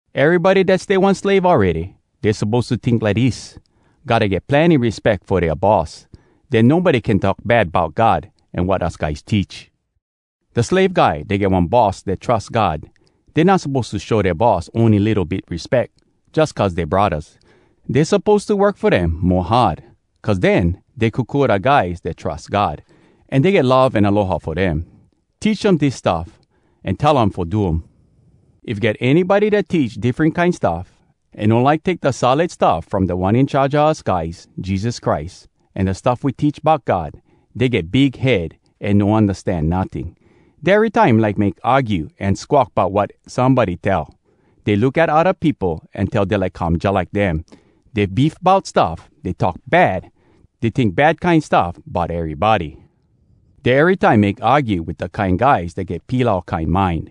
Erybody dat stay one slave awready, dey suppose to tink lidis: gotta get plenny respeck fo dea boss. Den nobody can talk bad bout God an wat us guys teach. Da slave guy dat get one boss dat trus God, dey not suppose to show dea boss ony litto bit respeck jus cuz dey braddahs. Dey suppose to work fo dem mo hard, cuz den dey kokua da guys dat trus God, an dey get love an aloha fo dem. Teach um dis stuff, an tell um fo do um. If get anybody dat teach diffren kine stuff, an no like take da solid stuff from Da One In Charge a us guys, Jesus Christ, an da stuff we teach bout God, dey get big head an no undastan notting. Dey erytime like make argue an squawk bout wat somebody tell. Dey look at odda peopo an tell dey like come jalike dem. Dey beef bout stuff. Dey talk bad. Dey tink bad kine stuff bout erybody. Dey erytime make argue wit da kine guys dat get pilau kine mind.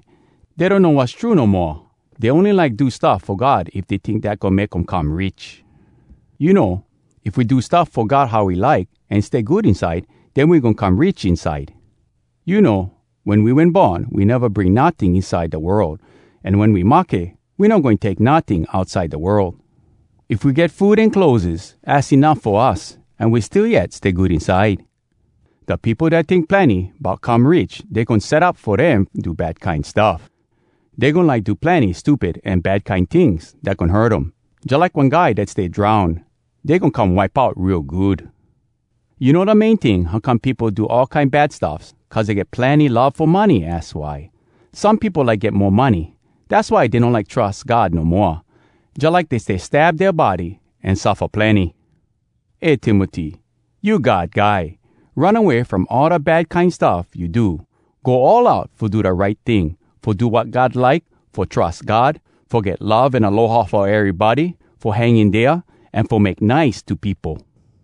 Dey donno wass true no moa. Dey ony like do stuff fo God if dey tink dat goin make um come rich. You know, if we do stuff fo God how he like, an stay good inside, den we goin come rich inside. You know, wen we wen born, we neva bring notting inside da world, an wen we mahke, we no goin take notting outside da world. If we get food an clotheses, az enuff fo us, an we still yet stay good inside. Da peopo dat tink plenny bout come rich, dey goin set up fo dem do bad kine stuff. Dey goin like do plenny stupid an bad kine tings dat goin hurt um. Jalike one guy dat stay drown, dey goin come wipe out real good. You know da main ting how come peopo do all kine bad stuffs? Cuz dey get plenny love fo money, az why! Some peopo like get mo money, dass why dey no like trus God no moa. Jalike dey stay stab dea body an suffa plenny. Eh Timoty, you God guy. Run away from all da bad kine stuff you do. Go all out fo do da right ting, fo do wat God like, fo trus God, fo get love an aloha fo erybody, fo hang in dea, an fo make nice to peopo.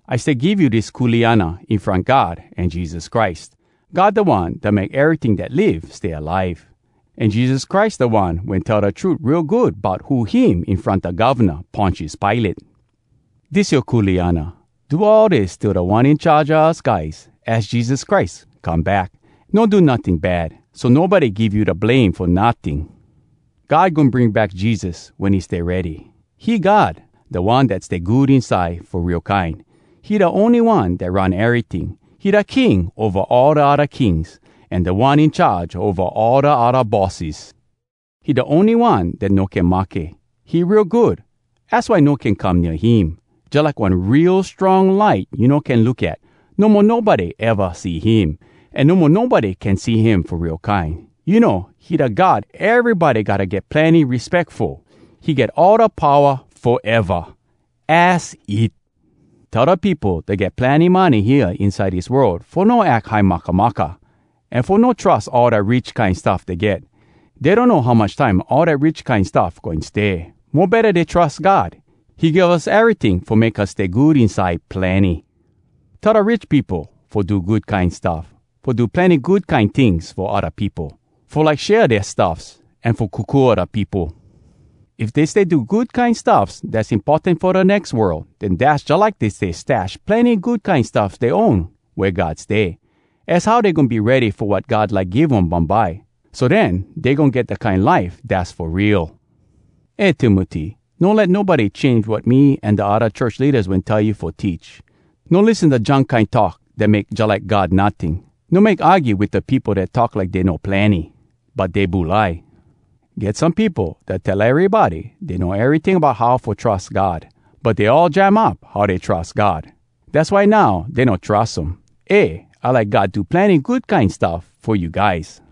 I stay give you dis kuleana in front God an Jesus Christ. God da One dat make eryting dat live stay alive. An Jesus Christ da one wen tell da trut real good bout who him in front da govna, Pontius Pilate. Dis yoa kuleana. Do all dis till Da One In Charge a us guys, az Jesus Christ, come back. No do notting bad, so nobody give you da blame fo notting. God goin bring back Jesus wen he stay ready. He God, da One dat stay good inside fo real kine. He da ony One dat run eryting. He da King ova all da odda kings, An Da One In Charge ova all da odda bosses. He da ony One dat no can mahke. He real good, az why no can come nea him, Jalike one real strong light you no can look at. No mo nobody eva see him, An no mo nobody can see him fo real kine. You know, he da God erybody gotta get plenny respeck fo. He get all da powa foeva! Az it! Tell da peopo dat get plenny money hea inside dis world fo no ack high makamaka, an fo no trus all da rich kine stuff dey get. Dey donno how much time all dat rich kine stuff goin stay. Mo betta dey trus God. He give us eryting fo make us stay good inside plenny. Tell da rich peopo fo do good kine stuff, fo do plenny good kine tings fo odda peopo, fo like share dea stuffs, an fo kokua da peopo. If dey stay do good kine stuffs dass importan fo da nex world, den dass jalike dey stay stash plenny good kine stuff dey own wea God stay. Az how dey goin be ready fo wat God like give um bumbye. So den, dey goin get da kine life dass fo real. Eh Timoty, no let nobody change wat me an da odda church leadas wen tell you fo teach. No lissen da junk kine talk dat make jalike God notting. No make argue wit da peopo dat talk like dey know plenny, but dey bulai. Get some peopo dat tell erybody dey know eryting bout how fo trus God, but dey all jam up how dey trus God. Dass why now dey no trus um. Eh! I like God do plenny good kine stuff fo you guys.